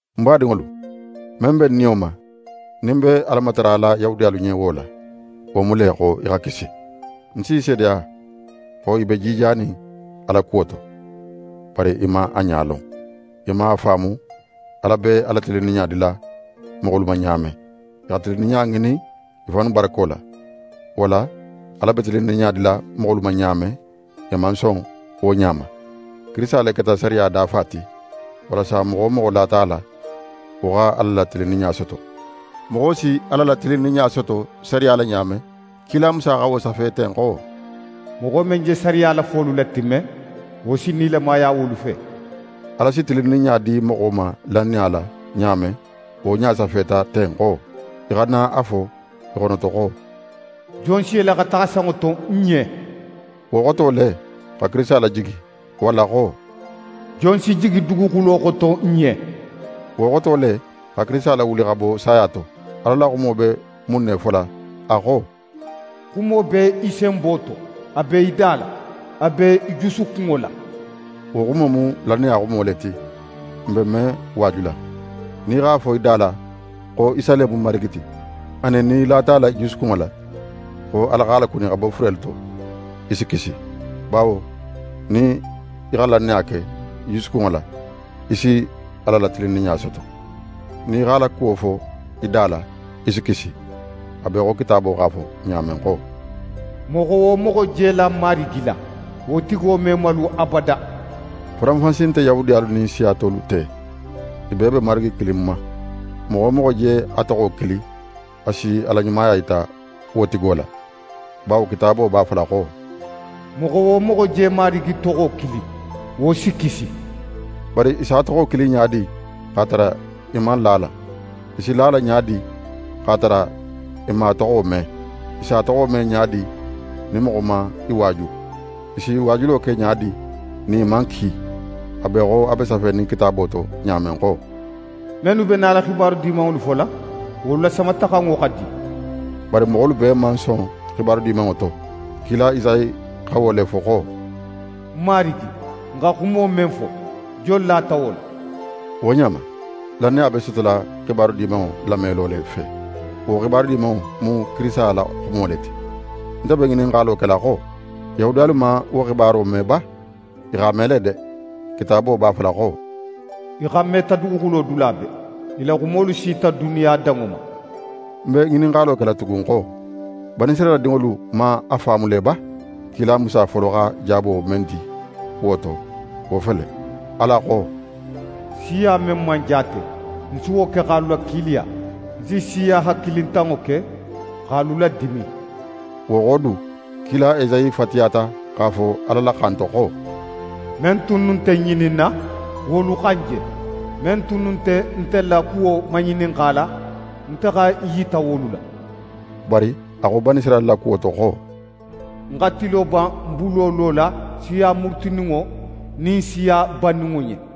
Ń badinŋolu, men be ń niyo ma, nin ń be Ala matarala Yahudiyalu ɲen wo la, wo mu le xo i xa kisi. Ń s'i seedeya, xo i be jijanin Ala kuwo to. Bari i man a ɲa lon. I man a faamu Ala be a la tilinninɲa dila moxolu ma ɲa men. I xa tilinninɲa ŋinin i fannu barako la. Wo la, Ala be tilinninɲa dila moxolu ma ɲa men, i man son wo ɲa ma. Kirisita le keta sariya dafa ti; walasa moxo wo moxo lata a la, wo xa Ala la tilinninɲa soto. Moxo si Ala la tilinninɲa soto sariya la ɲa men, kila Musa xa wo safe ten xo: «Moxo men je sariya la folu latimme, wo si nilamaya wolu fe.» Ala si tilinninɲa di moxo ma lannaya la ɲa men, wo ɲa safeta ten xo: Í xana a fo í xonoto xo: «Jon si yele xa taxa sanŋo to n ɲen?» Wo xoto le, xa Kirisita lajigi. Walla xo: «Jon si jigi duguxulo xoto n ɲen?» Wo xoto le, xa Kirisita lawuli xa bo saya to. Ala la xumo be mun ne fola? A xo: «Xumo be í senbo to, a be í da la, a be í jusukunŋo la.» Wo xumo mu lannaya xumo le ti, n be men waajula. Nin í x'a fo í da la xo Isa le mu Marigi ti, anin nin í lata a la í jusukunŋo la xo Ala x'a lakuni xa bo furelu to, í si kisi. Bawo nin í xa lannaya ke í jusukunŋo la, í si Ala la tilinninɲa soto. Nin í x'a la kuwo fo í da la, í si kisi. A be í xo Kitaabo x'a fo ɲa men xo: «Moxo wo moxo je la Marigi la, wo tigo me malu abada.» Faranfansi nte Yahudiyalu nin siya tolu te. I bee be Marigi kilin ma. Moxo wo moxo je a toxo kili, a si a la ɲumaya yita wo tigo la. Bawo Kitaabo b'a fola xo: «Moxo wo moxo je Marigi toxo kili, wo si kisi.» Bari i si a toxo kili ɲa di, x'a tara i man la a la? I si la a la ɲa di, x'a tara i man a toxo me? I si a toxo me ɲa di, nin moxo man i waaju? I si waajulo ke ɲa di, nin i man ki? A be í xo a be safenin Kitaabo to ɲa men xo: «Mennu be nala xibaru dimanŋolu fola, wolu la samataxanŋo xa di.» Bari moxolu bee man son xibaru Dimanŋo to. Kila Esayi xa wo le fo xo: «Marigi, n xa xumo men fo, jon lata wo la?» Wo ɲa ma, lannaya be sotola Xibaru Dimanŋo lamelo le fe. Wo Xibaru Dimanŋo mu Kirisita la xumo le ti. Nte be ŋininxalo kela xo: Yahudiyalu man wo xibaro me ba? I x'a me le de! Kitaabo b'a fola xo: «I xanmeta duguxulo dula bee. I la xumolu sita duniya danŋo ma.» Ń be ŋininxalo kela tugun xo: Banisirayila dinŋolu man a faamu le ba? Kila Musa folo xa jaabo men di wo to, wo fele: Ala xo: «Siya men man jaate, ń si wo ke x'alu lakiiliya. Ń si siya hakilintanŋo ke, x'alu ladimin.» Wo xo du, kila Esayi fatiyata x'a fo Ala la xan to xo: «Men tunnu nte ń ŋininna, wolu xa ń je. Men tunnu nte nte la kuwo maŋininxala, nte xa ń yita wolu la.» Bari a xo Banisirayila la kuwo to xo: «Ń xa tilo ban ń bulo lola siya murutininŋo nin siya banninŋo ɲen.»